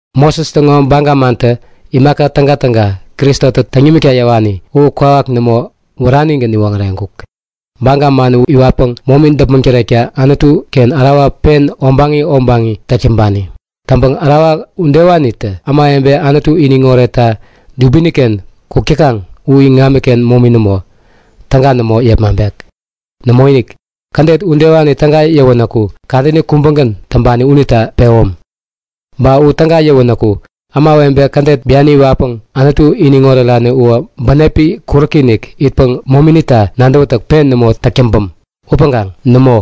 Moses täŋo baga mantä imaka tägatäga Kristotä täŋ nimikta yäwani u kwawak nämo, wäranigän niwoŋäreŋkuk. Baga man u iwatpäŋ momi däpmäŋ tärekta Anutu-ken ärawa pen obaŋi obaŋi täk täŋpani. Täŋpäŋ ärawa udewanitä ämawebe Anutu iniŋ oretta dubini-ken kuk täkaŋ u iŋamiken momini nämo, täga nämo yepmaŋpek. Nämoinik! Kädet udewani täga yäwänäku kadäni kubägän täŋpani unita pewäm. Ba u täga yäwänäku ämawebe kädet biani iwatpäŋ Anutu iniŋ orerani uwä bänepi kuräki-inik itpäŋ mominita nadäwätäk pen nämo täk täŋpäm. Upäŋkaŋ nämo!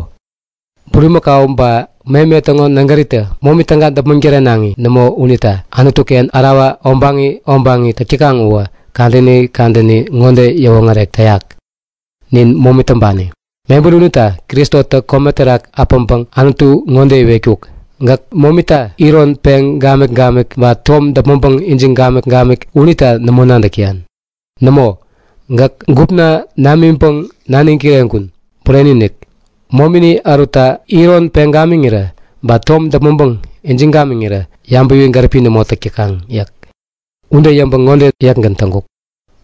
Bulimäkau ba meme täŋo nägäritä momi täga däpmäŋ tärenaŋi nämo unita Anutu-ken ärawa obaŋi obaŋi täk täkaŋ uwä kadäni kadäni ŋode yäwoŋärek täyak; Nin momi täŋpani. Mebäri unita Kristotä kome terak äpäŋpäŋ Anutu ŋode iwetkuk; Gäk momita iron peŋ gamik-gamik ba tom däpmäŋpäŋ ijiŋ gamik-gamik unita nämo nadäk täyan. Nämo, gäk gupna namiŋpäŋ naniŋ kireŋkun. Bureni-inik, momini ärutta iron peŋ gamiŋirä, ba tom däpmäŋpäŋ ijiŋ gamiŋirä yabäwi gäripi nämo täk täkaŋ yäk. Ude yäŋpäŋ ŋode yäkgän täŋkut;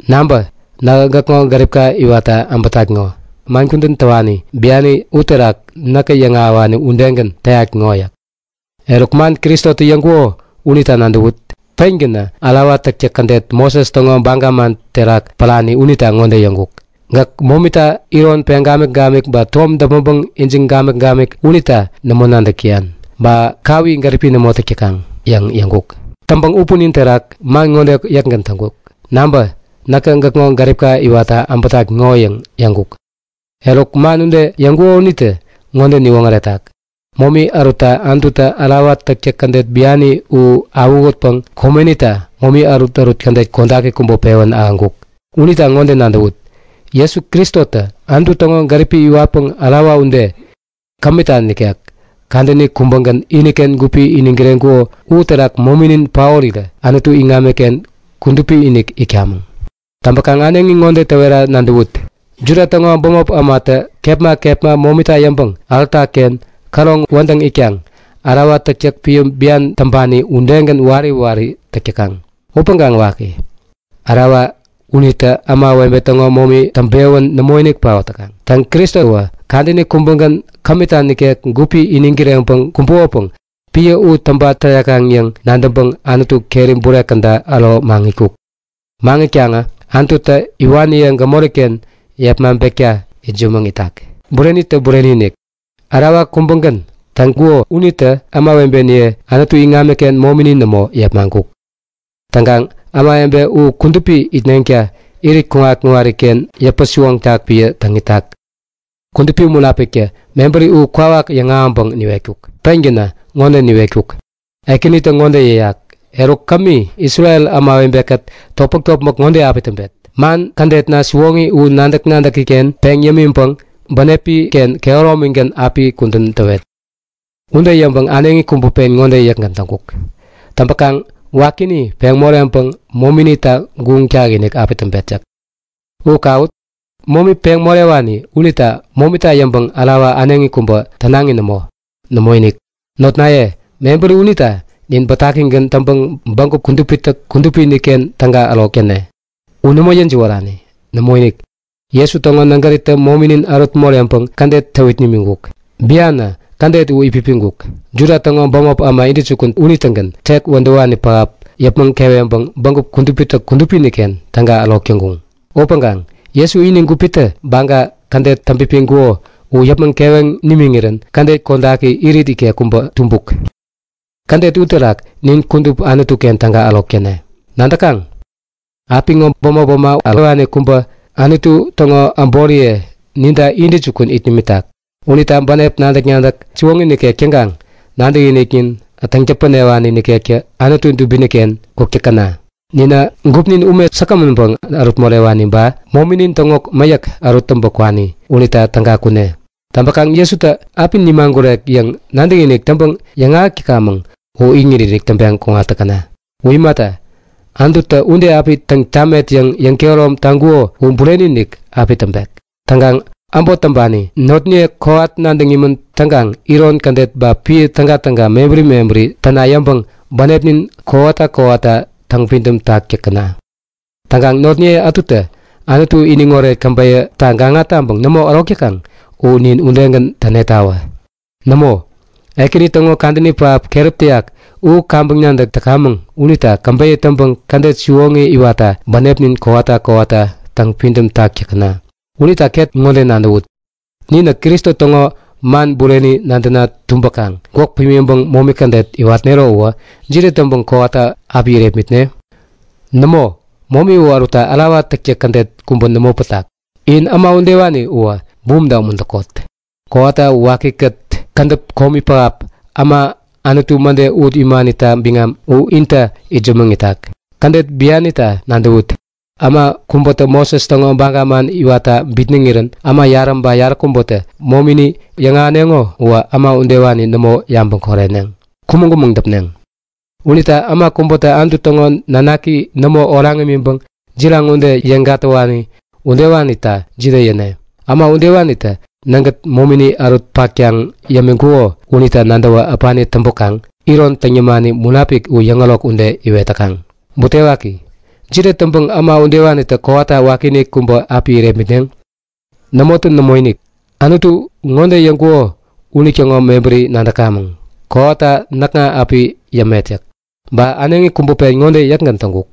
Nabä! Nähä gäkŋo gäripka iwatta äbätat ŋo. Man kudän täwani biani uterak näka yäŋahäwani udegän täyat ŋo yäk. Eruk, man Kristotä yäŋkuko unita nadäwut. Pengänä ärawa täktäk kädet Moses täŋo baga man terak pärani unita ŋode yäŋkuk; Gäk momita iron peŋ gamik-gamik ba tom däpmäŋpäŋ ijiŋ gamik-gamik unita nämo nadäk täyan ba kawi gäripi nämo täk täkaŋ yäŋ yäŋkuk. Täŋpäŋ u punin terak man ŋode yäkgän täŋkuk; Nabä! Näkä gäkŋo gäripka iwatta äbätat ŋo yäŋ yäŋkuk. Eruk, man ude yäŋkuko unitä ŋode niwoŋäretak; Momi ärutta Anututä ärawa täktäk kädet biani u awähutpäŋ komenita momi ärutärut kädet kodaki kubä pewän ahäŋkuk. Unita ŋode nadäwut; Jesu Kristotä Anutu täŋo gärip iwatpäŋ ärawa ude, kämita nikek, kadäni kubägän iniken gupi iniŋ kireŋkuko uterak mominin paorirä Anutu iŋamiken kudupi-inik itkamäŋ. Täŋpäkaŋ äneŋi ŋode täwera nadäwut; Juda täŋo bämop ämatä kepma kepma momita yäŋpäŋ alta-ken käroŋ wädäŋ itkaŋ ärawa täktäk piä bian täŋpani udegän wari wari täk täkaŋ. Upäŋkaŋ waki, ärawa unitä ämawebe täŋo momi täŋpewän nämoinik paot täkaŋ. Täŋ, Kristowä kadäni kubägän, kämita nikek gupi iniŋ kireŋpäŋ kumbuk. Täŋkaŋ piä u täŋpa tärekaŋ yäŋ nadäŋpäŋ Anutu keri bure käda äro maŋitkuk. Maŋitkaŋä Anututä iwaniye gämori-ken yepmaŋpekta itsämäŋ itak. Burenitä bureni-inik, ärawa kubägän täŋkuko unitä ämawebeniye Anutu iŋamiken momini nämo, yepmaŋkuk. Täŋkaŋ ämawebe u kudupi itneŋta irit kuŋat-kuŋariken yäpä-siwoŋtak piä täŋ itak. Kudupi Munapiktä mebäri u kwawak yäŋahäŋpäŋ niwetkuk. Pengänä ŋode niwetkuk; Ekänitä ŋode yäyak; Eruk, kämi Isrel ämawebe-kät topmäk-topmäk ŋode api täŋpet; Man kädetna siwoŋi u nadäk-nadäki-ken peŋ yämiŋpäŋ bänepi-ken kehäromigän api kudän täwet. Ude yäŋpäŋ äneŋi kubä pen ŋode yäkgän täŋkuk; Täŋpäkaŋ wakini peŋ moreŋpäŋ mominita guŋ takinik api täŋpet yäk. U kawut! Momi peŋ morewani unita momita yäŋpäŋ ärawa äneŋi kubä tänaŋi nämo. Nämoinik! Notnaye, mebäri unita nin bätakigän täŋpäŋ Bägup Kudupitä Kudupi-inik-ken täga ärok täne. U nämo yäjiwärani. Nämoinik, Jesu täŋo nägäritä mominin ärut moreŋpäŋ kädet täwit nimiŋkuk. Bianä kädet u itpipiŋkuk. Juda täŋo bämop äma intäjukun unitägän tek wädäwani pähap yäpmäŋ keweŋpäŋ Bägup Kudupitä Kudupi-inik-ken täga ärok täŋkuŋ. Upäŋkaŋ Jesu ini gupitä baga, kädet täŋpipiŋkuko u yäpmäŋ keweŋ nimiŋirän kädet kodaki, irit ikek kubä tumbuk. Kädet uterak nin kudup Anutu-ken täga ärok täne. Nadäkaŋ? Apiŋo bämop äma ärowani kubätä Anutu täŋo äboriye ninta intäjukun it nimitak. Unita bänep nadäk-nadäk siwoŋi nikek täŋkaŋ nadäkiniknin täŋ-täpänewani nikektä Anutu dubini-ken kuk täkäna! Ninä gupnin ume säkgämänpäŋ ärut morewani ba mominin täŋo mäyäk ärut täŋpä kwani unita täga kune! Täŋpäkaŋ Jesutä api nimagurek yäŋ nadäkinik täŋpäŋ yäŋahäk täkamäŋ u iŋit-inik täŋpeŋ kuŋat täkäna! U imata, Anututä ude api täŋ tamet yäŋ yäŋkehärom taŋkuko u bureni-inik api täŋpek. Täŋkaŋ äbot täŋpani notniye kowat nadäŋ imän täŋkaŋ iron kädet ba piä tägatäga mebäri mebäri täna yäŋpäŋ bänepnin kowata kowata täŋpidäm tak täkäna. Täŋkaŋ notniye ätutä Anutu iniŋoret käbeyäta gaŋa taŋpäŋ nämo ärok täkaŋ u nin udegän tänetawä! Nämo, Ekäni täŋo kadäni pähap keräp täyak u kaŋpäŋ nadäk täkamäŋ unita käbeyä täŋpäŋ kädet siwoŋi iwatta bänepnin kowata kowata täŋpidäm tak täkäna! Unita ket ŋode nadäwut; Ninä Kristo täŋo man bureni nadäna tumbäkaŋ gwäk pimiŋpäŋ momi kädet iwatnero uwä jide täŋpäŋ kowata api irepmitne? Nämo, momi u ärutta ärawa täktäk kädet kubä nämo pätak. In äma udewani uwä bumta umuntäkot! Kowata wakikät kädäp komi pähap, äma Anutu mäde ut imanita biŋam u inta itsämäŋtak. Kädet bianita nadäwut; Äma kubätä Moses täŋo baga man iwatta bitnäŋirän äma yarä ba yaräkubätä momini yäŋahäneŋo uwä äma udewani nämo yabäŋ koreneŋ, kumäŋ-kumäŋ däpneŋ. Unita äma kubätä Anutu täŋo nanaki nämo oraŋ imiŋpäŋ jiraŋ ude yeŋ gatäwani udewanita jide yäne? Äma udewanitä nägät momini ärut-paktaŋ yämiŋkuko unita nadäwä äpani täŋpäkaŋ iron täŋ yämani Munapik u yäŋärok ude iwet täkaŋ. Butewaki, jide täŋpäŋ äma udewanitä kowata wakiinik kubä api irepmitneŋ? Nämotä nämoinik. Anututä ŋode yäŋkuko unitäŋo mebäri nadäkamäŋ; Kowata näkŋa api yämet yäk. Ba äneŋi kubä pen ŋode yäkgän täŋkuk;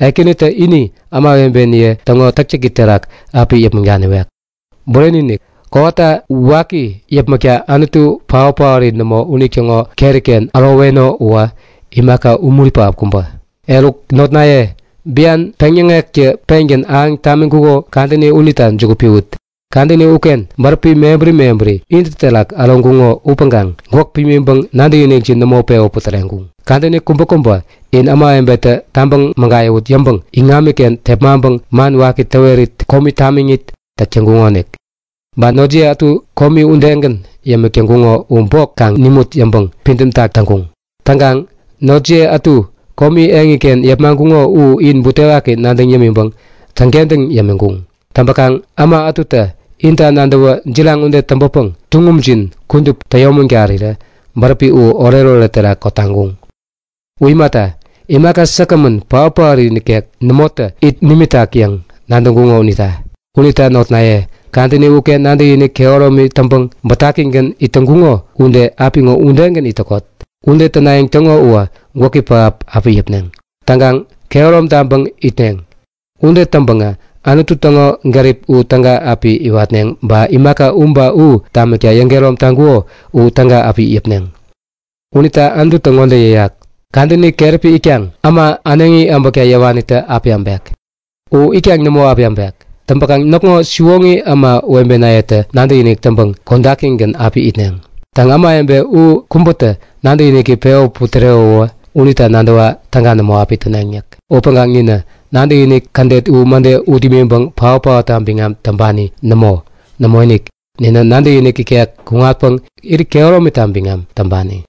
Ekänitä ini ämawebeniye täŋo täktäki terak api yäpmäŋ daniwek. Bureni-inik, kowata waki yäpmäkta Anutu paot-paori nämo unitäŋo keri-ken äroweno uwä imaka umuri pähap kubä. Eruk notnaye, bian peŋyäŋektä pengän ahäŋ tamiŋkuko kadäni unita juku piwut. Kadäni uken bäräpi mebäri mebäri intä terak äroŋkuŋo upäŋkaŋ gwäk pimiŋpäŋ nadäkinikjin nämo pewä putäreŋkuŋ. Kadäni kubäkubä in ämawebetä tabäŋ mägayäwut yäŋpäŋ iŋamiken tepmaŋpäŋ man waki täwerit komi tamiŋit täk täŋkuŋonik. Ba notjiye ätu komi udegän yämik täŋkuŋo u bok kaŋ nimut yäŋpäŋ pidämtak täŋkuŋ. Täŋkaŋ notjiye ätu komi eŋiken yepmaŋkuŋo u in butewaki nadäŋ yämiŋpäŋ täŋkentäŋ yämiŋkuŋ. Täŋpäkaŋ äma ätutä inta nadäwä jiraŋ ude täŋpäpäŋ tuŋumjin kudup täyomägarirä bäräpi u oretoret terak kotaŋkuŋ. U imata, imaka säkgämän, paotpaot nikek nämotä it nimikaŋ yäŋ nadäŋkuŋo unita. Unita notnaye, kadäni uken nadäkinik kehäromi täŋpäŋ bätakigän it täŋkuŋo ude, apiŋo udegän it täkot. Ude tänayäŋ täŋo uwä gwäki pähap api yäpneŋ. Täŋkaŋ kehärom taŋpäŋ itneŋ. Ude täŋpäŋä Anutu täŋo gärip u täga api iwatneŋ ba imaka u ba u tamikta yäŋkehärom taŋkuko u täga api yäpneŋ. Unita Anututä ŋode yäyak; Kadäni keräpi itkaŋ äma äneŋi äbäkta yäwanitä api äbek. U itkaŋ nämo api äbek. Täŋpäkaŋ näkŋo siwoŋi ämawebenayetä nadäkinik täŋpäŋ kodakgän api itneŋ. Täŋ, ämawebe u kubätä nadäkiniki pewän putärewäwä unita nadäwa täga nämo api täneŋ yäk. Upäŋkaŋ ninä nadäkinik kädet u mäde ut imiŋpäŋ paot-paotta biŋam täŋpani nämo. Nämoinik, ninä nadäkinik ikek kuŋatpäŋ irit kehäromita biŋam täŋpani.